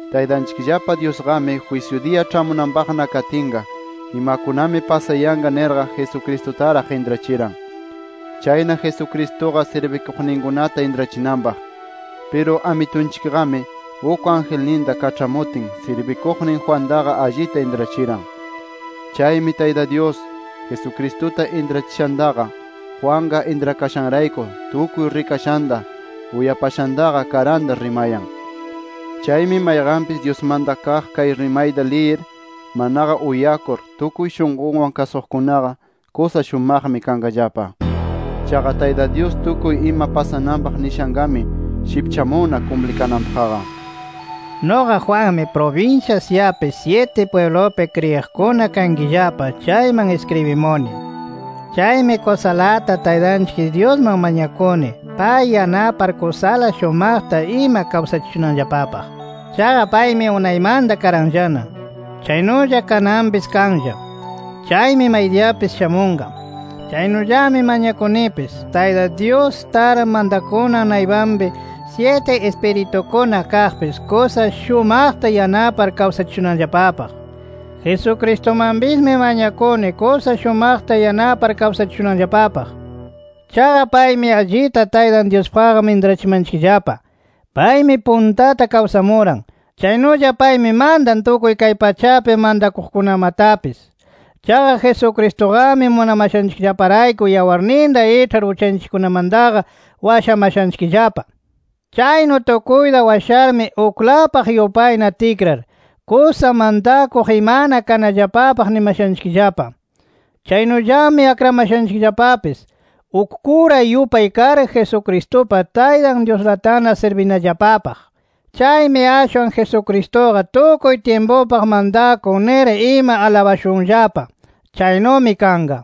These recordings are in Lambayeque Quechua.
Taytanchikllapa Dyusqami jwisyu diya ĉhamunanpaqna katinqa imakunami pasayanqa nirqa Jesucristutaraq intrachiran. Chayna Jesucristuqa sirbiqninkunata intrachinanpaq. Piru Amitunchikqami, uk angelninta kaĉhamutin sirbiqnin Juantaqa allita intrachiran. Chaymi Tayta Dyus, Jesucristuta intrachishantaqa Juanqa intrakashanrayku tukuy rikashanta, uyapashantaqa karanta rimayan. Chaymi mayqanpis Dyusmanta kaq kay rimayta liyir manaqa uyakur tukuy shunqunwan kasuqkunaqa kusa shumaqmi kanqallapa. Chaqa Tayta Dyus tukuy ima pasananpaq nishanqami shipchamunna kumplikananpaqqa. Nuqa Juanmi, prubinsya Asiapi syiti pwiblupi kriyiqkuna kankillapa chayman iskribimuni. Chaymi kusalata Taytanchik Dyusman mañakuni pay yanapar kusala shumaqta ima kawsachishunanllapapaq. Chaqa paymi unaymanta karanllana. Chaynulla kananpis kanlla. Chaymi maydiyapis shamunqa. Chaynullami mañakunipis Tayta Dyus tar mantakunan naypanpi syiti Ispiritukuna kaqpis kusa shumaqta yanapar kawsachishunanllapapaq. Jesucristumanpismi mañakuni kusa shumaqta yanapar kawsachishunanllapapaq. Chaqa paymi allita Taytan Dyuspaqqa intrachimanchikllapa. Paymi puntata kawsamuran. Chaynulla paymi mantan tukuy kay pachapi mantakuqkunamatapis. Chaqa Jesucristuqami munamashanchikllaparayku yawarninta iĉhar uchanchikkunamantaqa washamashanchikllapa. Chaynu tukuyta washarmi uklapaq yupayna tikrar, kusa mantakuq imana kanallapapaq nimashanchikllapa. Chaynullami akramashanchikllapapis uk kura yupay kar, Jesucristupa Taytan Dyuslatana sirbinallapapaq. ¡Chaymi ashwan Jesucristuqa tukuy tyimpupaq mantakun nir ima alabashunllapa! ¡Chaynumi kanqa!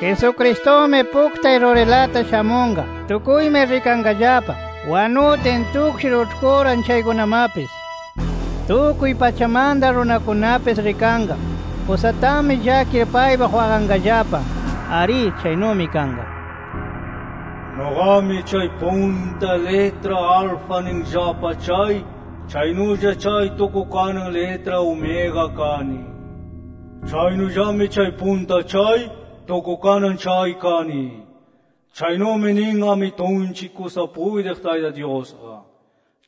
¡Jesucristumi puktay rurilata shamunqa! Tukuymi rikanqallapa, wanutin tukshir uĉhkuran chaykunamatapis. Tukuy pachamanta runakunapis rikanqa. Kusatami llakir paypaq waqanqallapa. ¡Arí chaynumi kanqa! “Nuqami chay punta litra Alfa ninllapa chay, chaynulla chay tukukanan litra Omega kani. Chaynullami chay punta chay, tukukanan chay kani”. Chaynumi nin Amitunchik kusa puytiq Tayta Dyusqa.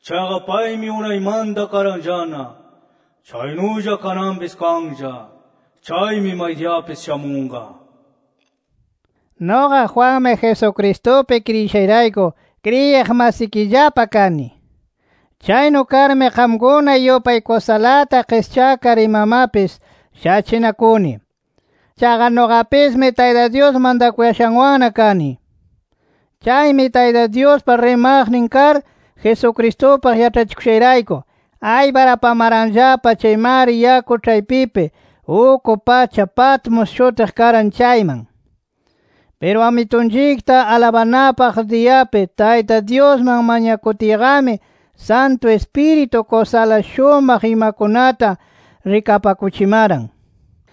Chaqa paymi unaymanta karanllana. Chaynulla kananpis kanlla. Chaymi maydiyapis shamunqa. Nuqa Juanmi, Jesucristupi kriyishayrayku kriyiq masikillapa kani. Chaynu karmi qamkuna yupay kusalata qischakar imamapis shachinakuni. Chaqa nuqapismi Tayta Dyus mantakuyashanwanna kani. Chaymi Tayta Dyuspa rimaqnin kar, Jesucristupaq yaĉhachikushayrayku, aypar apamaranllapa chay mar yaku ĉhaypipi uk pacha Patmos shutiq karan chayman. Piru Amitunchikta alabanapaq diyapi Tayta Dyusman mañakutiyqami, Santu Ispiritu kusala shumaq imakunata rikapakuchimaran,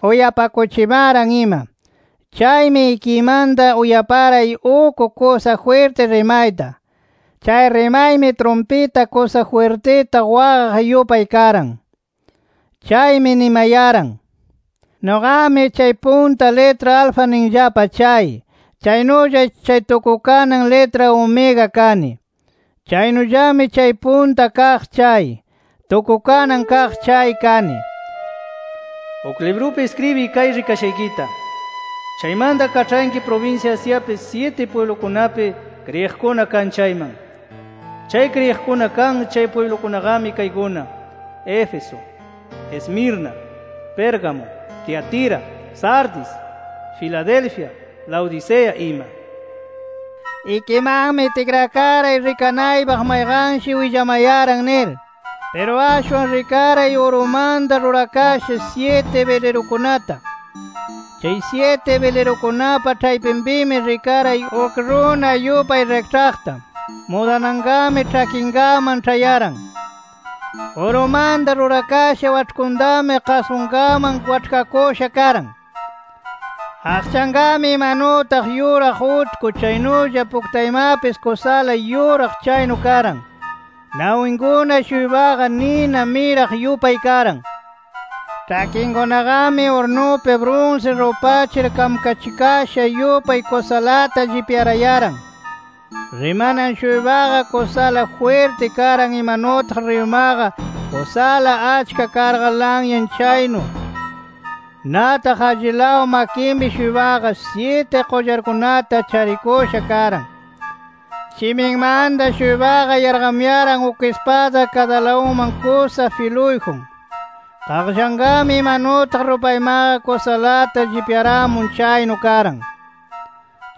uyapakuchimaran ima. Chaymi ikiymanta uyaparay uk kusa jwirti rimayta. Chay rimaymi trumpita kusa jwirtita waqaq yupay karan. Chaymi nimayaran: “[Nuqami chay punta litra Alfa ninllapa chay, chaynulla chay tukukanan litra Omega kani. Chaynullami chay Punta Kaq chay, Tukukanan Kaq chay kani.] Uk librupi iskribiy kay rikashaykita. Chaymanta kaĉhanki prubinsya Asiapi syiti pwiblukunapi kriyiqkuna kan chayman. Chay kriyiqkuna kan chay pwiblukunaqami kaykuna: Éfeso, Esmirna, Pérgamo, Tiatira, Sardis, Filadelfia, Laodicea ima”. Ikimanmi tikrakaray rikanaypaq mayqanshi willamayaran nir. Piru ashwan rikaray urumanta rurakasha syiti bilirukunata. Chay syiti bilirukunapa ĉhaypinpimi rikaray uk runa yupay rikĉhaqta. Mudananqami ĉhakinkaman ĉhayaran. Urumanta rurakasha waĉhkutami qasqunkaman waĉhkakusha karan. Aqchanqami imanutaq yuraq utku chaynulla puktaymapis kusala yuraq chaynu karan. Nawinkuna-shuypaqa, nina miraq yupay karan. Ĉhakinkunaqami urnupi brunsi rupachir kamkachikasha yupay kusalata llipyarayaran. Rimanan-shuypaqa, kusala jwirti karan imanutaq riyumaqa kusala achka karqa lanyan chaynu. Nataq allilaw makinpi-shuypaqa, syiti qullarkunata charikusha karan. Shiminmanta-shuypaqa yarqamuyaran uk ispada kadalawunman kusa filuyjun. Qaqllanqami imanutaq rupaymaqa kusalata llipyaramun chaynu karan.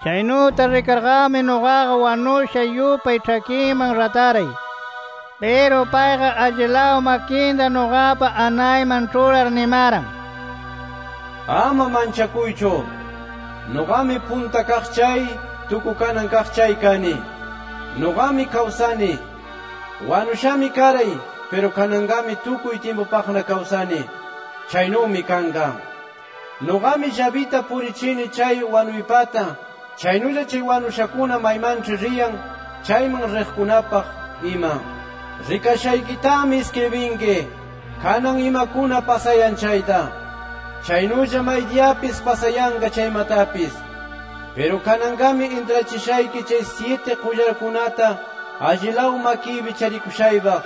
Chaynuta rikarqami nuqaqa wanusha yupay ĉhakinman rataray. Piru payqa allilaw makinta nuqapa anayman ĉhurar nimaran: “Ama manchakuychu. Nuqami Punta Kaq chay, Tukukanan Kaq chay kani. Nuqami kawsani. Wanushami karay. Piru kananqami tukuy tyimpupaqna kawsani. [Chaynumi kanqa]. Nuqami llabita purichini chay wanuypata, chaynulla chay wanushakuna maymanĉhi riyan chayman riqkunapaq ima. “Rikashaykitami iskribinki, kanan imakuna pasayan chayta, chaynulla maydiyapis pasayanqa chaymatapis. Piru kananqami intrachishayki chay syiti qullarkunata allilaw makiypi charikushaypaq,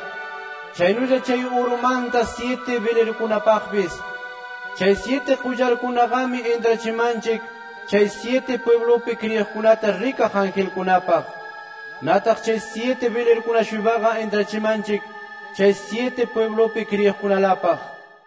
chaynulla chay urumanta syiti bilirukunapaqpis: Chay syiti qullarkunaqami intrachimanchik chay syiti pwiblupi kriyiqkunata rikaq angelkunapaq. Nataq chay syiti bilirukuna-shuypaqa intrachimanchik chay syiti pwiblupi kriyiqkunalapaq.